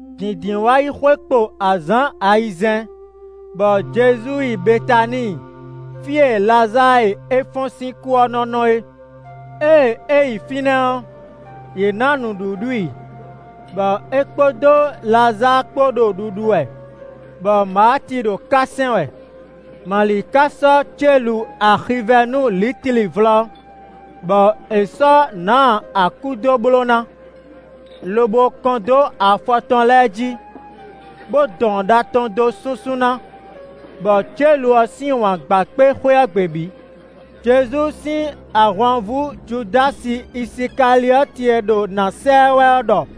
Dǐndínwáyixwe kpo azǎn ayizɛ́n, bɔ Jezu yi Betaníi fí e Lazáa e é fɔ́n sín kú ɔ́ nɔ́ nɔ é. Ée é yi fínɛ́ ɔ́, yě ná nǔɖuɖu i, bɔ é kpódó Lazáa kpó ɖo ɖuɖu wɛ, bɔ Maati ɖo ká sɛn wɛ. Mali ka sɔ́ célu axivɛ́nu lǐtli vlɔ́, bɔ è sɔ́ nǎ akú dó bló ná, lobo kɔn dó afɔ tɔn lɛ́ɛ jí, bó dɔn ɖa tɔn dó súnsún ná, bɔ célu ɔ́ sín wǎn gba kpé xwé ɔ́ gbe bǐ. Jezu sín ahwanvú Judási Isikaliɔ́ti e ɖo nǎ sa ɛ wɛ ɔ́ ɖɔ: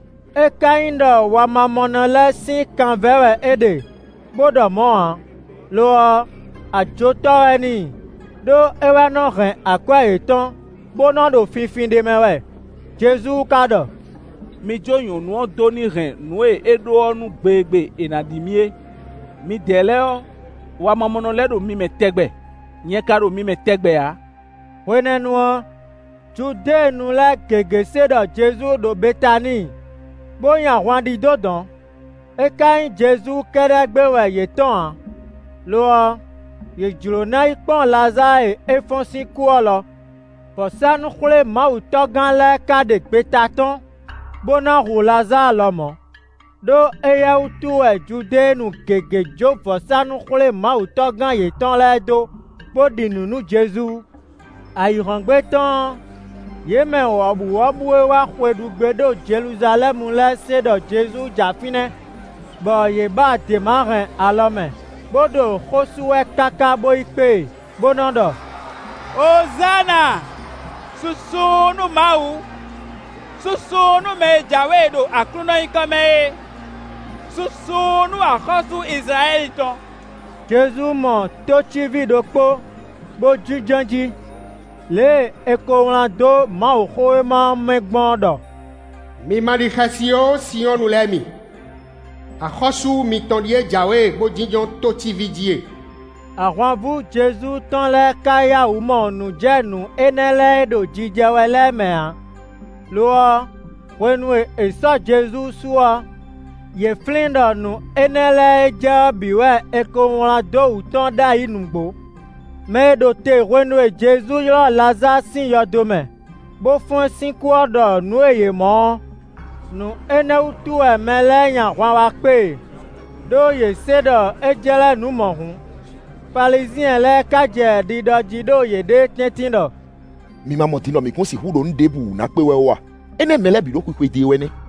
É ka nyí ɖɔ wamamɔnɔ lɛ́ɛ sín kan vɛ́ wɛ é ɖe, bo ɖɔ mɔ̌ ǎ; lo ɔ́, ajotɔ́ wɛ n'i, ɖó é wɛ nɔ hɛn akwɛ́ yětɔn, bó nɔ ɖo finfin ɖ'é mɛ wɛ. Jezu ka ɖɔ: “Mi jó nyɔ̌nu ɔ́ dó ní hɛn nǔ e é ɖó ɔ́ nú gbe e gbe è nǎ ɖi mì é. Midɛɛ lɛ́ɛ ɔ́, wamamɔnɔ lɛ́ɛ ɖo mi mɛ tɛgbɛ; nyɛ ka ɖo mi mɛ tɛgbɛ ǎ.” Hwenɛ́nu ɔ́, Judéenu lɛ́ɛ gěgé se ɖɔ Jezu ɖo Betaníi, bó nyi ahwan ɖidó dɔ̌n; é ka nyí Jezu kɛ́ɖɛ́ gbé wɛ yě tɔ́n ǎ, lo ɔ́, yě jló ná yi kpɔ́n Lazáa e é fɔ́n sín kú ɔ́ lɔ. Vɔ̌sánú-xwlémawutɔ́gán lɛ́ɛ ka ɖe gbeta tɔ́n, bó ná hu Lazáa lɔmɔ̌, ɖó éyɛ́ wútu wɛ Judéenu lɛ́ɛ gěgé jó vɔ̌sánú-xwlémawutɔ́gán yětɔn lɛ́ɛ dó, bó ɖi nǔ nú Jezu. Ayǐhɔ́ngbe tɔn ɔ́, yě mɛ wɔ̌buwɔ́bú e wá xwe ɖu gbé ɖo Jeluzalɛ́mu lɛ́ɛ se ɖɔ Jezu ja fínɛ́; bɔ yě ba děma hɛn alɔ mɛ, bo ɖo xó sú wɛ káká bo yi kpé e; bo nɔ ɖɔ: “Ozána! Susu nú Mawu! Susu nú mɛ e jǎwe ɖo Aklúnɔ nyǐkɔ mɛ é: susu nú axɔ́sú Izlayɛ́li tɔn.” Jezu mɔ tócíví ɖokpó bó jínjɔ́n jí, lě e è ko wlán dó Mawuxówéma ɔ́ mɛ gbɔn ɔ́ ɖɔ: “Mi ma ɖi xɛsi ó Sinyɔ́ɔnu lɛ́ɛ mi, axɔ́sú mitɔn ɖíe jǎwe bó jínjɔ́n tócíví jí e!” Ahwanvú Jezu tɔn lɛ́ɛ ka yá wǔ mɔ nǔ jɛ nǔ énɛ́ lɛ́ɛ e ɖo jijɛ wɛ lɛ́ɛ mɛ ǎ; lo ɔ́, hwenu e è sɔ́ Jezu su ɔ́, yě flín ɖɔ nǔ énɛ́ lɛ́ɛ e jɛ ɔ́ bǐ wɛ è ko wlán dó wú tɔn ɖ'ayǐ nǔgbó. Mɛ e ɖo te hwenu e Jezu ylɔ́ Lazáa sín yɔdo mɛ, bo fɔ́n ɛ sín kú ɔ́ ɖɔ nǔ e yě mɔ ɔ́. Nǔ énɛ́ wútu wɛ mɛ lɛ́ɛ nyi ahwan wá kpé e, ɖó yě se ɖɔ é jlɛ́ nǔ mɔ̌hun. Falizyɛn lɛ́ɛ ka jɛ ɖiɖɔ jí ɖo yěɖée tɛ́ntin ɖɔ: “Mi ma mɔ din ɖɔ mǐ kún sixú ɖo nǔ ɖěbǔ wú na kpé wɛ ó a? Énɛ́ mɛ lɛ́ɛ bǐ ɖo xwixwedó e wɛ nɛ́!”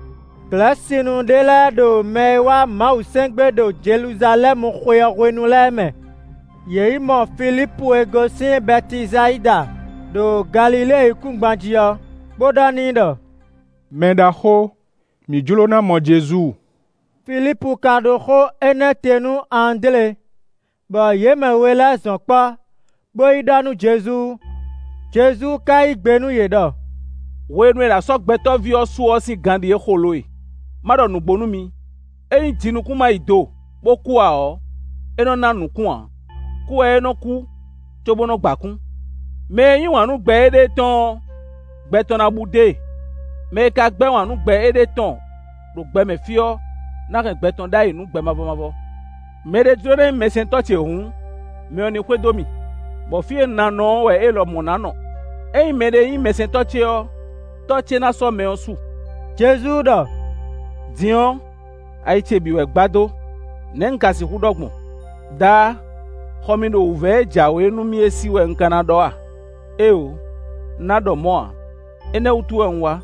Glɛ̌sinu ɖé lɛ́ɛ ɖo mɛ e wá Mawu sɛn gbé ɖo Jeluzalɛ́mu xwe ɔ́ hwenu lɛ́ɛ mɛ. Yě yi mɔ Filípu e gosín Bɛtisayida ɖo Galilée yíkúngban jí ɔ́, bo ɖɔ n'i ɖɔ: “Mɛɖaxó, mǐ jló ná mɔ Jezu.” Filípu ka yi ɖó xó énɛ́ te nú Andlé, bɔ yě mɛ we lɛ́ɛ zɔn kpɔ́, bo yi ɖɔ nú Jezu. Jezu ka yí gbe nú yě ɖɔ: “Hwenu e è nǎ sɔ́ Gbɛtɔ́ví ɔ́ su ɔ́ sín gan ɖíe xo lo e. Ma ɖɔ nǔgbó nú mi, ényí jinukún má yi do bó kú ǎ ɔ́, é nɔ ná nǔkún ǎ; kú wɛ é nɔ́ kú, cóbó nɔ gba kún. Mɛ e yí wǎn nú gbɛ éɖée tɔn ɔ́, gbɛ tɔn ná bú dó e; mɛ e ka gbɛ́ wǎn nú gbɛ éɖée tɔn ɖo gbɛ mɛ fí ɔ́ ná hɛn gbɛ tɔn ɖ'ayǐ nú gbɛ mavɔ mavɔ. Mɛ ɖé jló ná nyí mɛsɛntɔ́ ce hǔn, mɛ ɔ́ ní xwedó mì, bɔ fí e un ná nɔ ɔ́ wɛ é lɔmɔ̌ ná nɔ. Ényí mɛɖé nyí mɛsɛntɔ́ ce ɔ́, Tɔ́ ce ná sɔ́ mɛ ɔ́ su.” Jezu ɖɔ: “Din ɔ́, ayi ce bǐ wɛ gbadó. Nɛ̌ un ka sixú ɖɔ gbɔn? Daá, xɔ mì ɖo wǔvɛ́ e jǎwe nú mì é sí wɛ un ka na ɖɔ a? Éeǒ, un ná ɖɔ mɔ̌ ǎ; énɛ́ wútu wɛ un wá.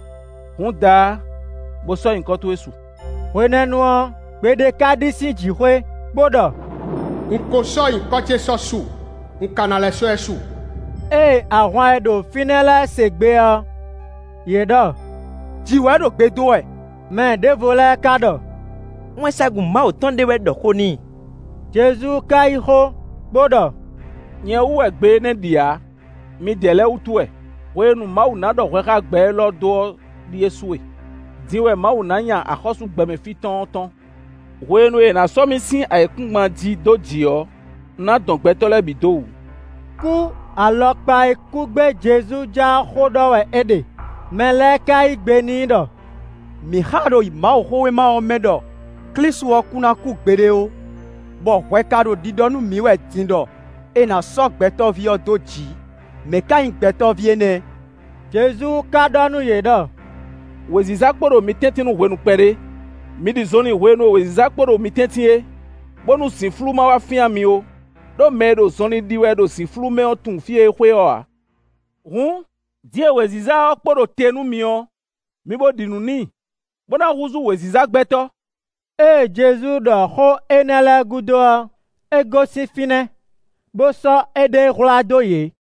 Hǔn Daá, bo sɔ́ nyǐkɔ towe su.” Hwenɛ́nu ɔ́, gbe ɖé ka ɖi sín jǐxwé, bó ɖɔ: “Un ko sɔ́ nyǐkɔ ce sɔ́ su; un ka ná lɛ́ sɔ́ ɛ su.” Ée ahwan e ɖo fínɛ́ lɛ́ɛ se gbe ɔ́, yě ɖɔ: “Jǐ wɛ ɖo gbe dó wɛ.” Mɛ ɖěvo lɛ́ɛ ka ɖɔ: “Wɛnsagun Mawu tɔn ɖé wɛ ɖɔ xó n'i.” Jezu ka yí xó bo ɖɔ: “Nyɛ wú wɛ gbe énɛ́ ɖi ǎ; midɛɛ lɛ́ɛ wútu wɛ. Hwenu e Mawu ná ɖɔ hwɛ xá gbɛ élɔ́ dó ɔ́ ɖíe su e; din wɛ Mawu ná nya axɔ́sú gbɛmɛ fí tɔn ɔ́ tɔ́n. Hwenu e è nǎ sɔ́ mì sín ayǐkúngban jí dó jǐ ɔ́, un ná dɔn gbɛtɔ́ lɛ́ɛ bǐ dó wǔ.” Kú alɔkpa e kú gbé Jezu ja ɔ́ xó ɖɔ wɛ é ɖe. Mɛ lɛ́ɛ ka yí gbe n'i ɖɔ: “Mǐ xa ɖo Mawuxówéma ɔ́ mɛ ɖɔ Klísu ɔ́ kún ná kú gbeɖé ó, bɔ hwɛ ka ɖo ɖiɖɔ nú mǐ wɛ din ɖɔ è nǎ sɔ́ Gbɛtɔ́ví ɔ́ dó jǐ. Mɛ̌ ká nyí Gbɛtɔ́ví énɛ́?” Jezu ka ɖɔ nú yě ɖɔ: “Wěziza kpo ɖo mi tɛ́ntin nú hwenu kpɛɖé; mi ɖi zɔnlin hwenu e wěziza kpo ɖo mi tɛ́ntin é, bónú zǐnflú má wá fyán mi ó; ɖó mɛ e ɖo zɔnlin ɖi wɛ ɖo zǐnflú mɛ ɔ́ tunwun fí e é xwe ɔ́ ǎ. Hǔn, din e wěziza ɔ́ kpo ɖo te nú mi ɔ́, mi bo ɖi nǔ n'i, bó ná húzú wěziza gbɛtɔ́.” Jwifu lɛ́ɛ ɖi nǔ nú Jezu ǎ Ée Jezu ɖɔ xó énɛ́ lɛ́ɛ gúdo ɔ́, é gosín fínɛ́, bó sɔ́ éɖée hwlá dó yě.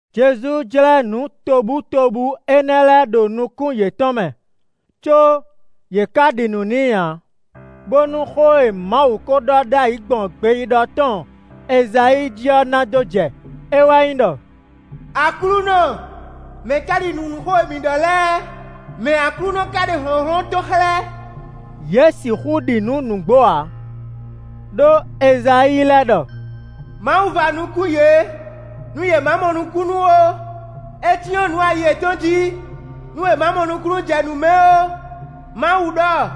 Jezu jlɛ́ nǔ tobutóbú énɛ́ lɛ́ɛ ɖo nukún yětɔn mɛ, có yě ká ɖi nǔ n'i ǎ; bónú xó e Mawu ko ɖɔ ɖ'ayǐ gbɔn gbeyíɖɔ tɔn Ezayíi jí ɔ́ ná dó jɛ; é wɛ nyí ɖɔ: “Aklúnɔ, mɛ̌ ka ɖi nǔ nú xó e mǐ ɖɔ lɛ́ɛ? Mɛ̌ Aklúnɔ ka ɖe hlɔ̌nhlɔ́n tɔn xlɛ́?” Yě sixú ɖi nǔ nǔgbó ǎ, ɖó Ezayíi lɛ́ ɖɔ: “Mawu va nukún yě, nú yě má mɔ nukúnnú ó; é cyɔ́n nǔ ayi yětɔn jí, nú yě ma mɔ nukúnnú jɛ nǔ mɛ ó. Mawu ɖɔ: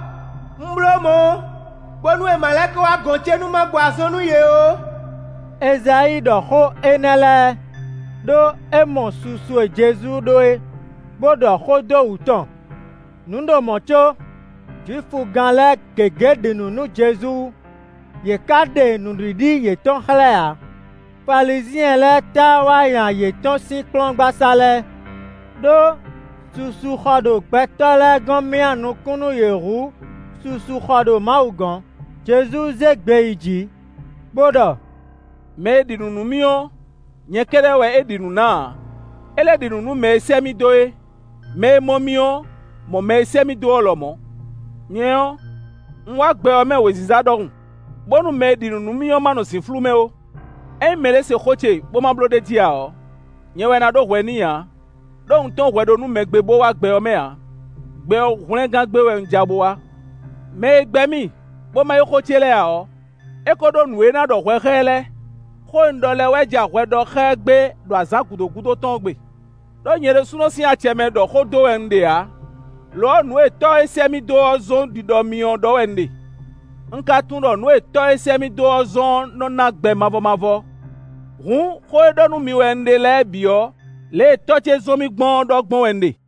‘Un bló mɔ̌, bónú yě ma lɛ́ kɔ wá gɔ̌n ce nú má gbɔ azɔn nú yě ó.’” Ezayíi ɖɔ xó énɛ́ lɛ́ɛ, ɖó é mɔ susu e Jezu ɖó é, bó ɖɔ xó dó wǔ tɔn. Nǔ ɖo mɔ̌ có Jwifugán lɛ́ɛ gěgé ɖi nǔ nú Jezu; yě ká ɖe nǔɖiɖi yětɔn xlɛ́ ǎ, Falizyɛn lɛ́ɛ táá wá nya yě tɔ́n sín kplɔ́ngbasá lɛ́ɛ. Đó susu xɔ ɖo gbɛtɔ́ lɛ́ɛ gɔ́n myá nukún nú yě hú susu xɔ ɖo Mawu gɔ́n. Jezu zé gbe yi jǐ, bo ɖɔ: “Mɛ e ɖi nǔ nú mì ɔ́, nyɛ kɛ́ɖɛ́ wɛ é ɖi nǔ ná ǎ; é lɛ́ ɖi nǔ nú mɛ e sɛ́ mì dó é. Mɛ e mɔ mì ɔ́, mɔ mɛ e sɛ́ mì dó ɔ́ lɔmɔ̌. Nyɛ ɔ́, un wá gbɛ ɔ́ mɛ wěziza ɖɔhun, bónú mɛ e ɖi nǔ nú mì ɔ́ ma nɔ zǐnflú mɛ ó. Ényí mɛɖé se xó ce, bó ma bló ɖ'é jí ǎ ɔ́, nyɛ wɛ ná ɖó hwɛ n'i ǎ, ɖó un tɔ́n hwɛ ɖó nú mɛ gbé bó wá gbɛ ɔ́ mɛ ǎ; gbɛ ɔ́ hwlɛngán gbé wɛ un ja bó wá. Mɛ e gbɛ́ mì, bó ma yí xó ce lɛ́ɛ ǎ ɔ́, é ko ɖó nǔ e na ɖɔ hwɛ xá ɛ lɛ́ɛ; xó e un ɖɔ lɛ́ɛ wɛ ja hwɛ ɖɔ xá ɛ gbé ɖo azǎn gǔdo gúdo tɔn ɔ́ gbe. Đó nyɛ ɖésúnɔ sín acɛ mɛ ɖɔ xó dó wɛ un ɖe ǎ; lo ɔ́, nǔ e Tɔ́ e sɛ́ mì dó ɔ́ zɔ́n ɖiɖɔ mì ɔ́ ɖɔ wɛ un ɖe. Un ka tunwun ɖɔ nǔ e Tɔ́ e sɛ́ mì dó ɔ́ zɔ́n ɔ́ nɔ ná gbɛ mavɔ mavɔ. Hǔn, xó e ɖɔ nú mi wɛ un ɖe lɛ́ɛ bǐ ɔ́, lě e Tɔ́ ce zɔ́n mì gbɔn ɔ́ ɖɔ gbɔn wɛ un ɖe.”